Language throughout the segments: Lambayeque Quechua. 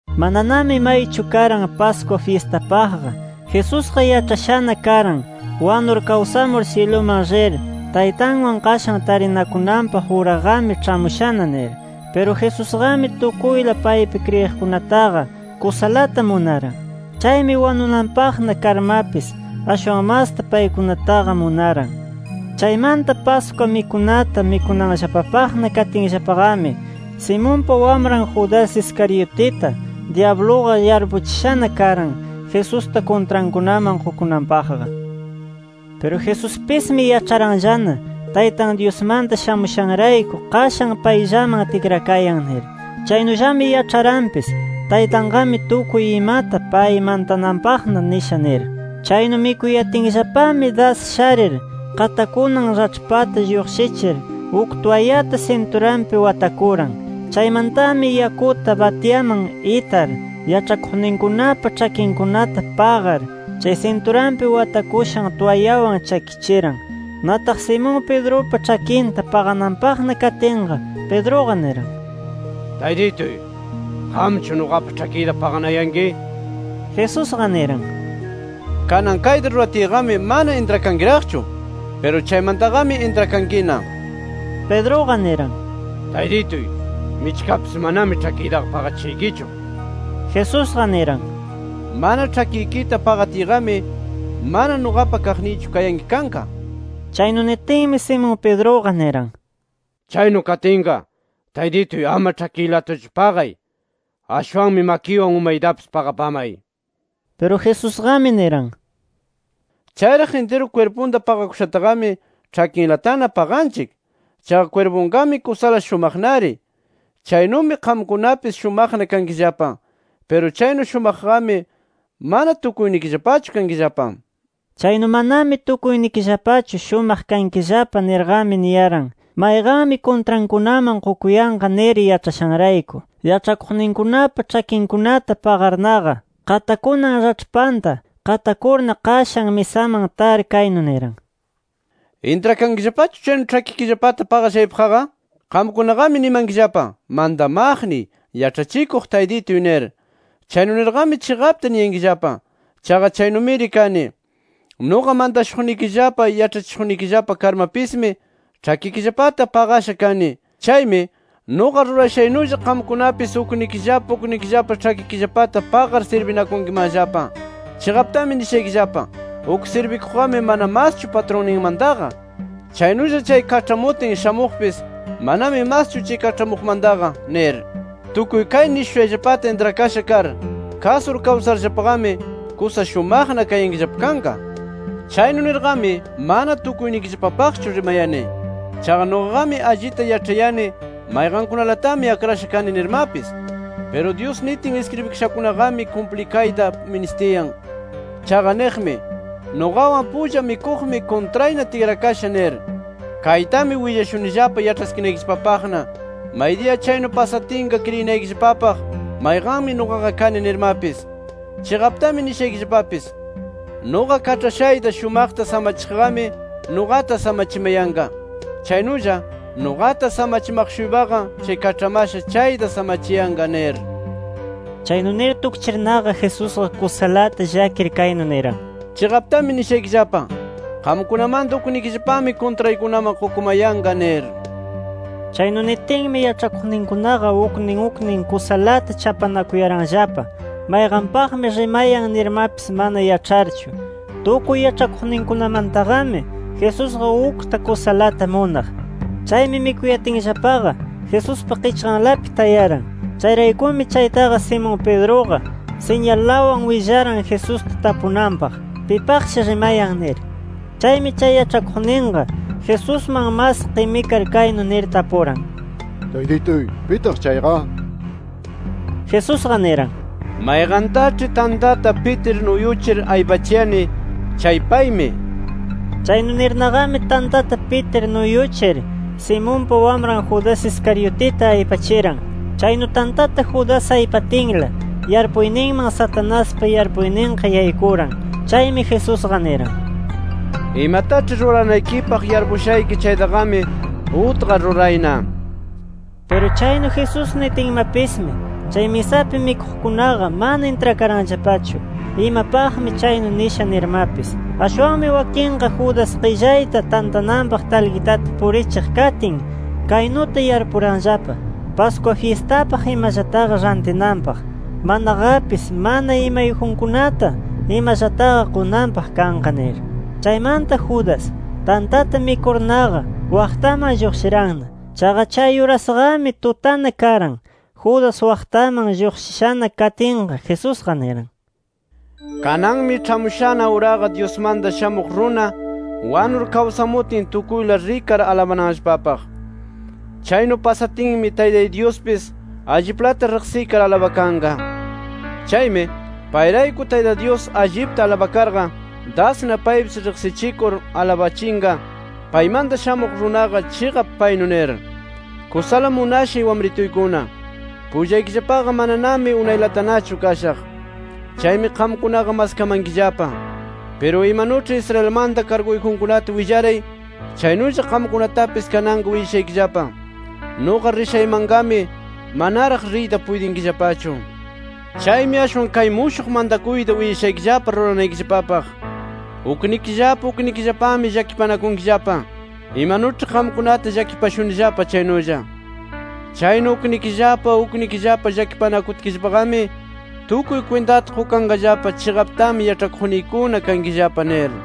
Mananami maychu karan Pascua fyistapaqqa. Jesusqa yaĉhashana karan, wanur kawsamur syiluman rir Taytanwan qashan tarinakunanpaq uraqami ĉhamushana nir. Piru Jesusqami tukuyla paypi kriyiqkunataqa kusalata munaran. Chaymi wanunanpaqna karmapis ashwan masta paykunataqa munaran. Chaymanta Pascua mikunata mikunanllapapaqna katinllapaqami, Simonpa wamran Judas Iscariotita dyabluqa yarpuchishana karan, Jesusta kuntrankunaman qukunanpaqqa. Piru Jesuspismi yaĉharanllana, Taytan Dyusmanta shamushanrayku qashan payllaman tikrayan nir. Chaynullami yaĉharanpis Taytanqami tukuy imata pay mantananpaqna nisha nir. Chaynu mikuyatinllapami das sharir, qatakunan raĉhpanta lluqshichir uk twayata sinturanpi watakuran. Chaymantami yakuta batyaman itar, yaĉhakuqninkunapa ĉhakinkunata paqar, chay sinturanpi watakushan twayawan chakichiran. Nataq Simón Pedrupa ĉhakinta paqananpaqna katinqa, Pedruqa niran: —Taytituy, ¿qamchu nuqapa ĉhakiyta paqanayanki? Jesusqa niran: —Kanan kayta ruratiyqami mana intrakankiraqchu. Piru chaymantaqami intrakankina nir. Pedruqa niran: —¡Taytituy, michkapis manami ĉhakiytaqa paqachishaykichu! nir. Jesusqa niran: —Mana ĉhakikita paqatiyqami, mana nuqapa kaqniychu kayanki kanqa, nir. Chaynu nitinmi Simón Pedruqa niran: —¡Chaynu katinqa, Taytituy ama ĉhakiylatachu paqay! ¡Ashwanmi makiywan umaytapis paqapamay! nir. Piru Jesusqami niran: —Chayraq intiru kwirpunta paqakushataqami ĉhakinlatana paqanchik. Chaqa kwirpunqami kusala shumaqnari. Chaynumi qamkunapis shumaqna kankillapa. Piru chaynu shumaqqami mana tukuynikillapachu kankillapa. Chaynu, “Manami tukuynikillapachu shumaq kankillapa” nirqami niyaran, mayqanmi kuntrankunaman qukuyanqa nir yaĉhashanrayku. Yaĉhakuqninkunapa ĉhakinkunata paqarnaqa qatakunan raĉhpanta qatakurna qashan misaman tar, kaynu niran: “¿Intrakankillapachu, chaynu ĉhakikillapata paqashaypaqqa? Qamkunaqami nimankillapa: Mantamaqniy, Yaĉhachikuq Taytituy nir. Chaynu nirqami chiqapta niyankillapa. Chaqa chaynumiri kani. Nuqa mantashuqnikillapa, yaĉhachishuqnikillapa karmapismi ĉhakikillapata paqasha kani. Chaymi, nuqa rurashaynulla, qamkunapis uknikillapa uknikillapa ĉhakikillapata paqar sirbinakunkimanllapa. “Chiqaptami nishaykillapa: Uk sirbikuqqami mana maschu patrunninmantaqa. Chaynulla chay kaĉhamutin shamuqpis manami maschu chay kaĉhamuqmantaqa nir. Tukuy kay nishushayllapata intrakasha kar, kasur kawsarllapaqami, kusa shumaqna kayankillapa kanqa. “Chaynu nirqami, mana tukuynikillapapaqchu rimayani. Chaqa nuqaqami allita yaĉhayani mayqankunalatami akrasha kani nirmapis. Piru Dyus nitin iskribikashanqami kumplikayta ministiyan. Chaqa niqmi: ‘Nuqawan pulla mikuqmi, kuntrayna tikrakasha’ nir. Kaytami willashunillapa yaĉhaskinaykillapapaqna, maydiya chaynu pasatinqa, kriyinaykillapapaq mayqanmi nuqaqa kani nirmapis. Chiqaptami nishaykillapapis: Nuqa kaĉhashayta shumaqta samachiqqami, nuqata samachimayanqa. Chaynulla, nuqata samachimaq-shuypaqa, chay kaĉhamasha chayta samachiyanqa” nir. Chaynu nir tukchirnaqa, Jesusqa kusalata llakir kaynu niran: —Chiqaptami nishaykillapa: Qamkunamanta uknikillapami kuntraykunaman qukumayanqa nir. Chaynu nitinmi yaĉhakuqninkunaqa uknin uknin kusalata chapanakuyaranllapa, mayqanpaqmi rimayan nirmapis mana yaĉharchu. Tukuy yaĉhakuqninkunamantaqami Jesusqa ukta kusalata munaq. Chaymi mikuyatinllapaqa Jesuspa qichqanlapi tayaran. Chayraykumi chaytaqa, Simón Pedruqa siñalawan willaran Jesusta tapunanpaq, pipaqshi rimayan nir. Chaymi chay yaĉhakuqninqa Jesusman mas qimikar kaynu nir tapuran: —Taytituy, ¿pitaq chayqa? nir. Jesusqa niran: —Mayqantaĉhi, tantata pitir nuyuchir aypachiyani chay paymi nir. Chaynu nirnaqami tantata pitir nuyuchir, Simonpa wamran Judas Iscariotita aypachiran. Chaynu tantata Judas aypatinla, yarpuyninman Satanaspa yarpuyninqa yaykuran. Chaymi Jesusqa niran: —Imataĉhi ruranaykipaq yarpushayki chaytaqami, utqar rurayna, nir. Piru chaynu Jesús nitinmapismi, chay misapi mikuqkunaqa mana intrakaranllapachu, imapaqmi chaynu nisha nirmapis. Ashwanmi wakinqa Judas qillayta tantananpaq talqitata purichiq katin kaynuta yarpuranllapa: Pascua fyistapaq imallataqa rantinanpaq, manaqapis mana imayjunkunata imallataqa qunanpaq kanqa nir. Chaymanta Judas tantata mikurnaqa, waqtaman lluqshiranna. Chaqa chay urasqami, tutana karan. Judas waqtaman lluqshishana katinqa, Jesusqa niran: —Kananmi ĉhamushana uraqa Dyusmanta Shamuq Runa wanur kawsamutin, tukuyla rikar alabananllapapaq. Chaynu pasatinmi Taytay Dyuspis alliplata riqsikar alabakanqa. Chaymi, payrayku Tayta Dyus allipta alabakarqa, dasna paypis riqsichikur alabachinqa, paymanta Shamuq Runaqa chiqap paynu nir. Kusala munashay wamrituykuna, pullaykillapaqa mananami unaylatanachu kashaq. Chaymi qamkunaqa maskamankillapa. Piru imanuĉhi Israelmanta karguyjunkunata willaray, chaynulla qamkunatapis kananqa willashaykillapa: Nuqa rishaymanqami manaraq riyta puytinkillapachu. Chaymi ashwan kay mushuq mantakuyta willashaykillapa ruranaykillapapaq: Uknikillapa uknikillapami llakipanakunkillapa, imanuĉhi qamkunata llakipashunillapa chaynulla. Chaynu uknikillapa uknikillapa llakipanakutkillapaqami, tukuy kwintata qukanqallapa, chiqaptami yaĉhakuqniykuna kankillapa, nir.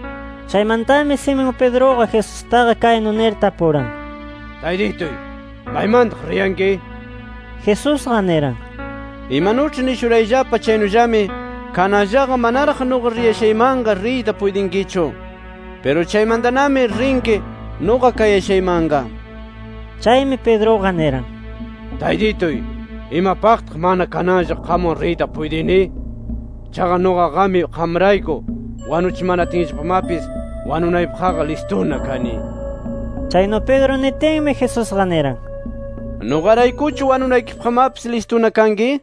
Chaymantami Simón Pedruqa Jesustaqa kaynu nir tapuran: —Taytituy, ¿maymantaq riyanki? Jesusqa niran: —Imanuĉhi nishurayllapa chaynullami kananllaqa manaraq nuqa rishaymanqa riyta puytinkichu. Piru chaymantanami rinki nuqa kayashaymanqa nir. Chaymi Pedruqa niran: —Taytituy, ¿imapaqtaq mana kananlla qamwan riyta puytini? ¡Chaqa nuqaqami qamrayku wanuchimanatinllapamapis wanunaypaqqa listuna kani! nir. Chaynu Pedro nitinmi, Jesusqa niran: —¿Nuqaraykuchu wanunaykipaqmapis listuna kanki?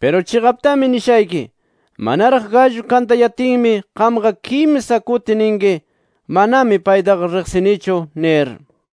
Piru chiqaptami nishayki: Manaraq gallu kantayatinmi, qamqa kimsa kuti ninki: ‘Manami paytaqa riqsinichu’ nir.